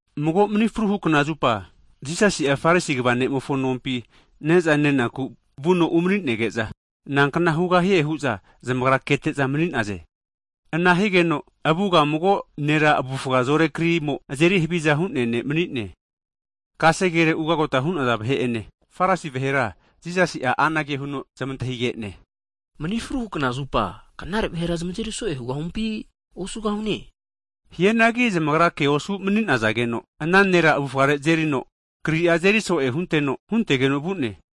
Mago mni fruhu knazupa (sabati) Jisasi'a Farisi kva ne'mofo nompi ne'za nenaku vuno umani'nege'za, nankna hugahie hu'za zamagra kete'za mani'naze. Ana higeno avuga mago nera avufga zore krimo azeri haviza hu'nea ne' mani'ne. Kasegere ugota hu'naza vahe ene, Farisi vahera Jisasi'a anage huno zmantahigene. Mni fruhu knazupa (Sabat) knare vahera zmazeri so'e hugahumpi osugahune? Hianagi zamagra ke osu manizageno, ana nera avufare azerino kri'a azeri so'e huteno huntegeno vu'ne.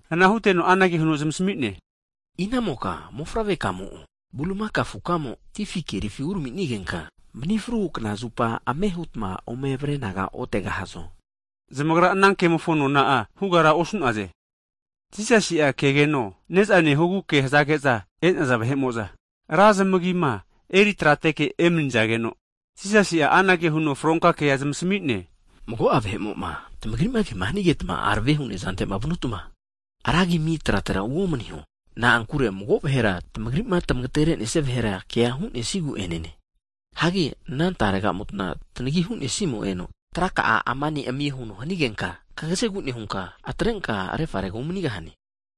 Ana huteno anage huno zmasami'ne, inamoka mofavrekamo'o bulimaka afukamo ti afi kerifi uraminenigenka, mni fruhu (sabati) knazupa ame hutma ome avare anaga otegahazo? Zamagra ana kemofo nona'a hugara osu'naze. Jisasi'a kegeno ne'za nehogu ke hazage'za e'naza vahemo'za, ra zmagima eri trateke emanizageno, Jisasi'a anage huno fronka kea zmasami'ne. Mago'a vahe'mo'ma, tamagri'ma ke hanigetma arave hu nezantema vanutma, ra agima ami tratera uomniho. Na'ankure mago vahera tmagrima tmagaterenesi'a vahera kea hu'nesigu'enene. Hagi ana taregamota tanagi hu'nesimo eno, traka'a ama ne' amio huno hanigenka, kagazegu nehunka atrenka refarega umanigahane.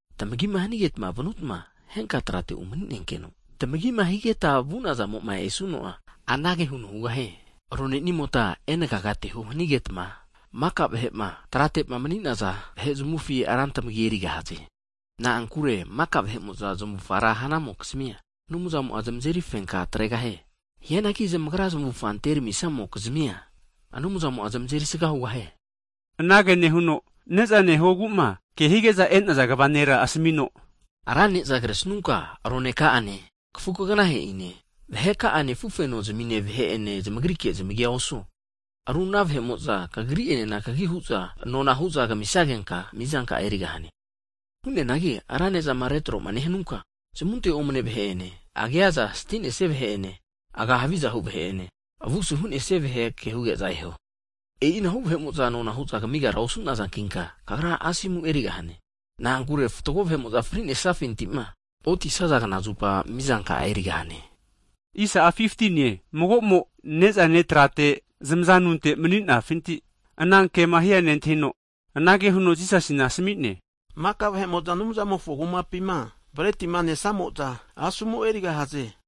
Tamagima hanigetma vanutma henka trate umani'nenkeno, tamagima higeta vu'nazamo'ma esuno'a, anage huno hugahie. Ronenimota, enagagateho hanigetma, maka trate'ma mani'naza vahe zmufina ra tmagia erigahaze. Na'ankure maka vahe'mo'za zmavufga ra hanamokizmia, Anumzamo'a zmazeri fenka tregahie. Hianagi zamagra zmavufga anteramisamokizmia, Anumzamo'a zmazeri sga hugahie. Anage nehuno, neza nehoguma ke hige'za e'naza kva nera asamino, ra ne'za kresnunka roneka'ane, kafu kaganahe'ine, vaheka'ane afufeno zimine vahe'ene zamagrike zamagi osuo. Ru ana vahe'mo'za kagri'enena ke hu'za nona hu'za kamisagenka mizanka'a erigahane. Hu'neanagi ra nezama retroma nehanunka, zmunte omne vahe'ene, agia aza stinesia vahe'ene, aga havizahu vahe'ene, avusu hu'nesnia vahe kea huge'za eho. E'inahu vahe'mo'za nona hu'za kamigara osu'nazankinka, kagra asomu erigahane. Na'ankure fatgo vahe'mo'za frinesafintima otisaza knazupa mizanka'a erigahane. Mago'mo nezane trate zamaza tununte mni'nafinti ana kema hia nentahino, anage huno Jisasina asmi'ne. Maka vahe'mo'za Anumzamofo Kumapima bretima nesamo'za asomu erigahaze!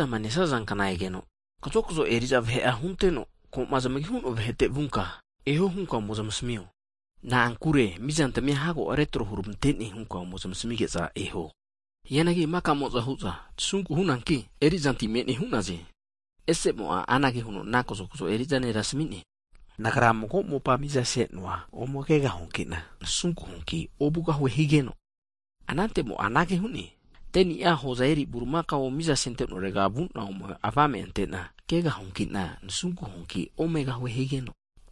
Ne'zama nesaza kna egeno, kazokzo eri'za vahe'a hunteno, koma zamagi hu'noa vahete vunka eho hunka ome zmasamio. Na'ankure mizantamia hago retro huramante'ne hunka ome zmasamige'za eho. Hianagi maka'mo'za hu'za tasunku hunanki, eri'zanti me'ne hu'naze. Ese'mo'a anage huno ana kazokzo eriza nera asmi'ne. Nagra mago mopa mizasenoa ome kegahuankina, nasunku huanki ovugahue. Anante'mo'a anage hu'ne, 10ni'a hoza eri burimakao miza sentenorega vu'na ome avame ante'na kegahuankina, nasunku huanki omegahue.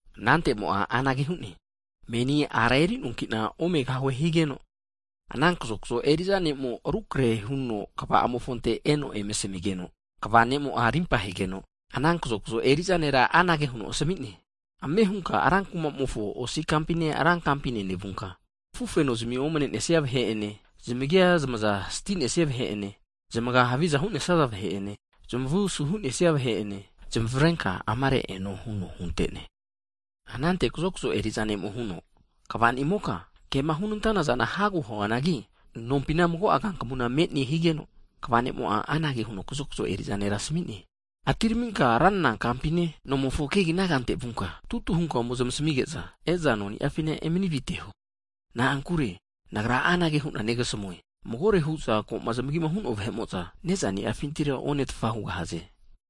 Anante'mo'a anage hu'ne, meni ara eri'noanki'na omegahue. Ana kazokzo eriza ne'mo rukrehe huno kva'amofonte eno eme asmi'geno, kva nemo'a rimpa hegeno, ana kazokzo eri'za nera anage huno asmi'ne. Ame hunka ra kumamofo osi kampine ra kampine nevunka, afufenozmi omne'nesnia vahe'ene, zmagia zmaza stinesia vahe ene, zamaga haviza hu'nesnaza vahe'ene, zamavu asu hu'nesnia vahe'ene zamavrenka amare eno huno hunte'ne. Anante kazokzo eri'za ne'mo huno kva'nimoka, kema hunantanazana hago huanagi nompina mago'a kankamuna me'ne higeno, kva ne'mo'a anage huno kazokzo eri'za nera asmi'ne. Atiraminka ranra kampine nomofo kegina kante vunka tutu hunka ome zmasamige'za, e'za noni'afina emani aviteho. Na'ankure Nagra anage hu'na negasamue, magore hu'za koma zmagima hu'noa vahe'mo'za, nezani'afintira onetfa hugahaze.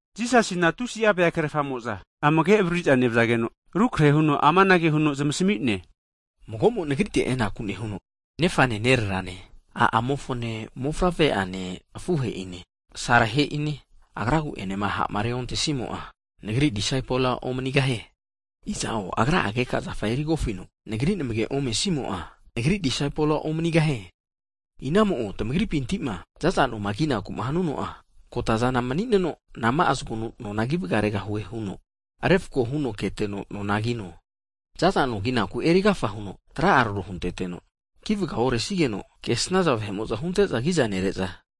Jisasina tusi'a vea krerfamo'za amage avaririza nevzageno, rukrehe huno amanage huno zamasmi'ne. Mago'mo Nagrite enaku nehuno, nefane nererane a'amofone, mofavre'ane afuhe'ine, asarehe'ine, agra'agu'enema ha'ma reontesimo'a, Nagri disaipol omanigahie. Iza'o agra'a keka zafa erigofino Nagri namage omesimo'a, Nagri disaipol omanigahie. Iza'o tmagripintima zaza noma kinaku hanuno'a, kotazana manineno nama'a zgonu nona ki vgaregahue huno refako huno keteno nona kino. Zaza no kinaku eri agafa huno tra'a tro hunteteno, ki vga oresigeno, kesnaza vahe'mo'za hunte'za agiza nere'za,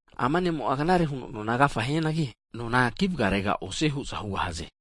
ama ne'mo'a knare huno nona agafa hianagi, nona kivgaregara osie hu'za hugahaze.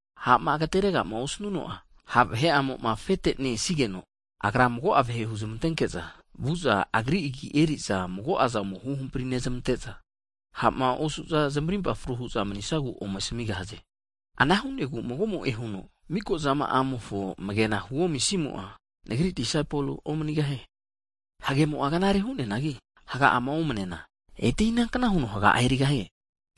Ha'ma agateregama osnuno'a, ha' vahe'amoma afete ne-esigeno, agra mago'a vahe huzmantenke'za vu'za agri agi eriza magoaza ome huhampri nezmante'za ha'ma osu'za zmarimpa fru hu'za manisagu ome asmigahaze. Ana hu'negu mago'mo'e huno, mikozama'amofo amagena huomisimo'a, Nagri disaipol omanigahie. Hagemo'a knare hu'neanagi, haga'ama omnena, ete inankna huno haga'a erigahie?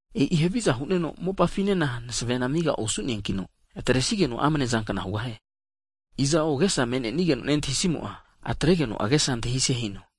E'i haviza hu'neno mopamofonena masevena amigara osu'neankino, atresigeno amnezankna hugahie. Iza'o agesa me'nenigeno nentahisimo'a, atregeno agesa antahise hino.